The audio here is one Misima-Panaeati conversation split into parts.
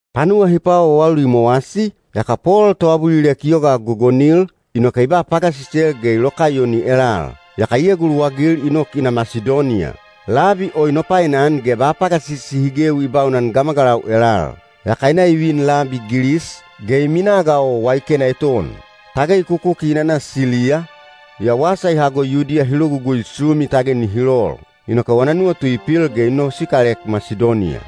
Panuwa hi paawaawauli i mowasi, yaka Pol toabulilek i yoga gogonil, inoke i ba pagasisel ge i lokaiyoni elal. Yaka i eguluwagil i nok i na Masidoniya. Labi o i nopainan ge ba pagasisi hi gewi i baunan gamagalau elal. Yaka i na i vin labi Gilis, ge i minaa ga o waikena eton. Tage i kukuki i nana Siliya, yaa wasa i hago Yudiya hi logugui sumi tage nihi lol. Inoke wana nuwatu i pil ge i nosikalek Masidoniya.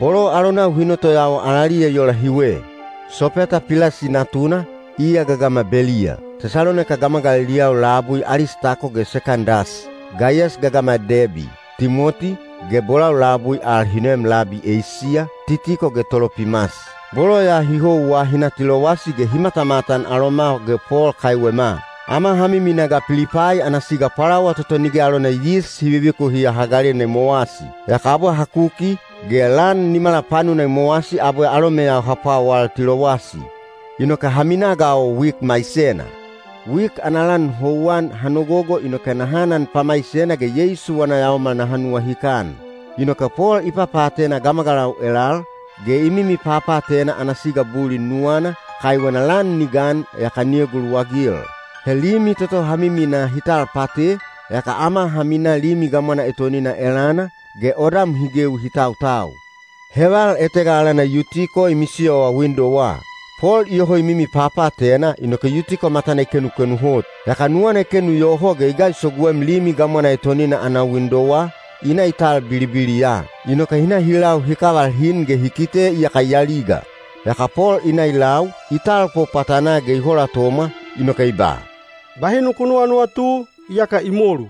Bolo alonau hi notoyawa alaliya i ola hiwe: Sopeta Pilasi natuna, iya gagama Beliya; Tesalonaika gamagaliliyau labui Alistako ge Sekandas; Gaiyas gagama Debi; Timoti, ge bolau labui al hi noem labi Eisiya, Titiko ge Tolopimas. Bolo ya hi houwa hi na Tilowasi ge hi matamatan aloma ge Pol kaiwema. Ama ha miminaa ga Pilipai ana siga Pwalawa toto Nige alona Yis Hi Vivikuhiya Hagalena i mowasi. Yaka abwe ha kuki, ge lan nimala panuna i mowasi abwe alomeyau ha pwawal Tilowasi. Inoke ha minaa ga o wik maisena. Wik ana lan houwan ha nogogo inoke naha anan pamaisena ge Yeisu wana yaomal naha nuwahikan. Inoke Pol i papaatena gamagalau elal, ge i mimi papaatena ana siga bulin nuwana, kaiwena lan ni gan yaka ni eguluwagil. He limi toto ha miminaa hi tal pate, yaka ama ha minaa limi gamwana etonina elana, ge odam hi gewi hi tautau. Heval etega alana Yutiko i misiyowa windowa. Pol iyoho i mimi papaatena inoke Yutiko matana i kenukenu hot. Yaka nuwana i kenu yoho ge i gaisoguem limi gamwana etonina ana windowa, i na i tal bilibiliya. Inoke hi na hi lau hi kaval hin ge hi kite iyaka i aliga. Yaka Pol i na i lau, i talpo pwatanaa ge i holatomwa, inoke i ba, “Bahi nuku nuwanuwatu, iyaka i molu.”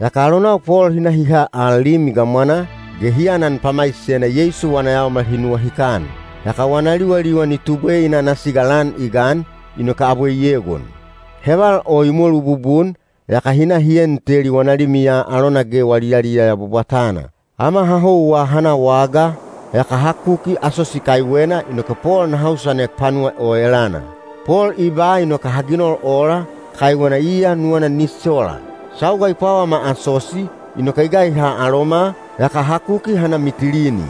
Yaka alonau Pol hi na hi ha al limi gamwanaa, ge hi anan pamaisena Yeisu wana yaomal hi nuwahikan. Yaka wana liwaliwan i tubwe i na ana siga lan i gan, inoke abwe i egon. Heval o i molu bubun, yaka hi na hi en teli wana limiya alona ge wali yaliyaya bwabwatana. Ama ha houwa ha na wagaa, yaka ha kuki Asosi kaiwena inoke Pol naha usanek panuwa o elana. Pol i ba inoke ha ginol ola, kaiwena iya nuwana ni sola. Sauga i pwawama Asosi, inoke i gaiha aloma, yaka ha kuki ha na Mitilini.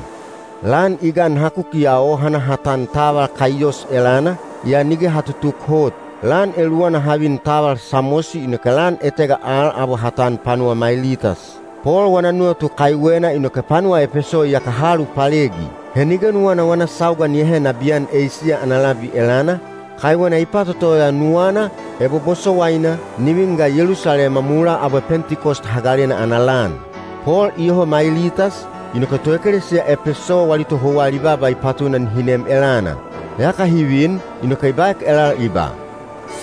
Lan i gan ha kukiya o ha na ha tan taval Kaiyos elana, yaa nige ha tutuk hot. Lan eluwana ha vin taval Samosi inoke lan etega al abwe ha tan panuwa Mailitas. Pol wana nuwatu kaiwena inoke panuwa Epeso iyaka ha alupalegi. He nige nuwana wana sauga ni ahe nabiyan Eisiya ana labi elana, kaiwena i patotoya nuwana, ebo bosowaina, ni vin ga Yelusalema mulaa abwe Pentikos Hagalena ana lan. Pol iyoho Mailitas, inoke toekelesiya Epeso wali tohouwa ali baaba i patuna nihi nem elana. Yaka hi vin, inoke i baek elal i ba,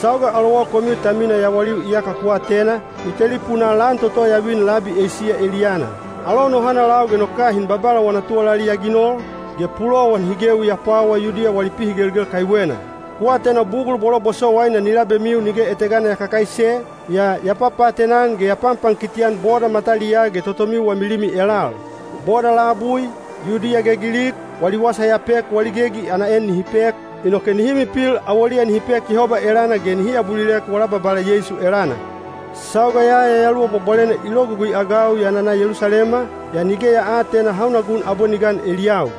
“Sauga alowau komiu ta mina yawaliu iyaka ku atena, i telipunaa lan toto ya vin labi Eisiya eliyana. Alou no hanalau ge no kahin Babala wana tuwalali ya ginol, ge pulowan hi gewi ya pwawa Yudiya wali pihigelgel kaiwena. Ku atena bugul bolo bosowaina ni labemiu nige etegana ya kakaise, yaa ya papaatena-an ge ya panpankiti-an boda mataliyaa ge totomiu wami limi elal. Boda labui, Yudiya ge Gilik, wali wasa ya pek wali gegi ana en nihi pek, inoke nihi mipil awoliya nihi pek Yehoba elana ge nihi abulilek wala Babala Yeisu elana. Sauga ya Yayaluwa Bwabwalena i logugui-agau ya nana Yelusalema, yaa nige ya aatena hauna gun abwe ni gan eliyau.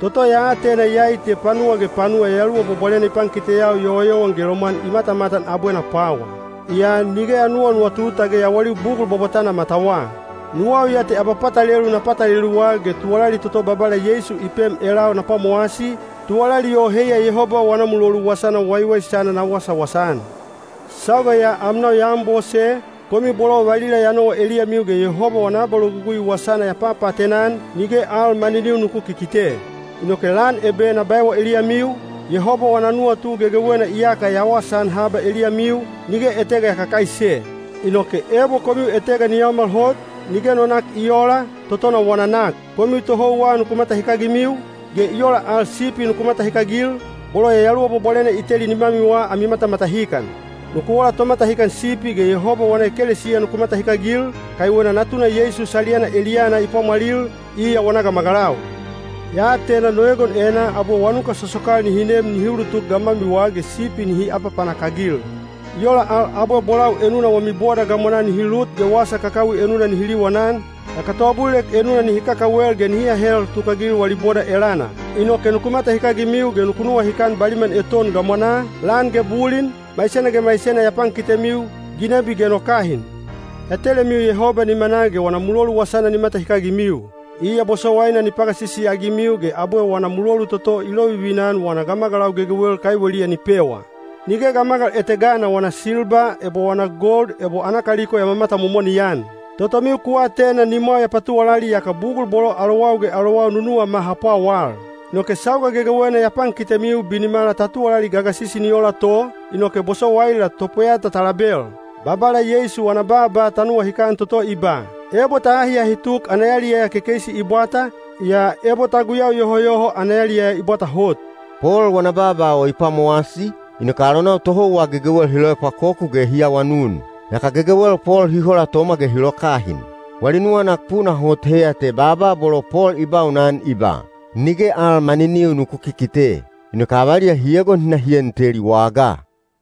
Toto ya atena iyai te panuwa ge panuwa Yayaluwa Bwabwalena i pankiteyau yowayowan ge lomwan i matamatan abwe na pwawa. Yaa nige ya nuwanuwatu tage yawaliu bugul bwabwatana matawa. Nuwau ya te abapatalelu na pataleluwa ge tuwalali toto Babala Yeisu i pem elau na pwamowasi, tuwalali o heiya Yehoba wana mulolu wasana waiwaisana na wasawasa-an. Sauga ya amnau ya anbose, komiu bolo valila ya nowa eliyamiu ge Yehoba wana abalogugui wasana ya papaatena-an, nige al maniniu nuku kikite. Inoke lan ebe na baewa eliyamiu, Yehoba wana nuwatu gegewena iyaka ya wasaan haba eliyamiu, nige etega ya kakaise. Inoke ebo komiu etega ni yaomal hot, nige no nak i oola, totona wana nak. Komiu tohouwa nuku matahikagimiu, ge i ola al sipi nuku matahikagil, bolo Yayaluwa Bwabwalena i teli nimamiwa ami matamatahikan. Nuku ola tomatahikan sipi ge Yehoba wana ekelesiya nuku matahikagil, kaiwena Natuna Yeisu saliyana eliyana i pwamwalil, iya wana gamagalau. Ya atena no egon enaa abwe wanuka sosokal nihi nem nihi ulutuk gamwamiwa ge sipi nihi apapanak-agil. I ola al abwe bolau enuna wami boda gamwanaa nihi lut ge wasa kakawi enuna nihi liwanan, yaka toabulilek enuna nihi kakawel ge nihi ahel tukagil wali boda elana. Inoke nuku matahikagimiu ge nuku nuwahikan baliman eton gamwanaa, lan ge bulin, maisena ge maisena ya pankitemiu, ginebi ge no kahin. Ya telemiu Yehoba nimanaa ge wana mulolu wasana ni matahikagimiu. Iya bosowaina ni pagasisi-agimiu ge abwe wana mulolu toto i lovivina-an wana gamagalau gegewel kaiweliya ni pewa. Nige gamagal etegana wana silba ebo wana gold ebo ana kaliko ya mamatamomoni-an. Totomiu ku atena nimwau ya patuwalali yaka bugul bolo alowau ge alowau nunuwama ha pwawal. Inoke sauga gegewena ya pankitemiu binimala ta tuwalali gagasisi ni ola to, inoke bosowaila topweyata ta label. Babala Yeisu wana baaba ta nuwahikan toto i ba, ‘Ebo ta ahiahi tuk ana yaliyaya kekeisi i bwata, yaa ebo ta guyau yohoyoho ana yaliyaya i bwata hot.’” Pol wana baaba o i pwamowasi, inoke alonau tohouwa gegewel hi loepwakoku ge hi awanun. Yaka gegewel Pol hi holatomwa ge hi lokahin. Wali nuwanak puna hot heiya te baaba bolo Pol i baunan i ba, “Nige al maniniu nuku kikite.” Inoke avaliya hi egon hi na hi en teli wagaa.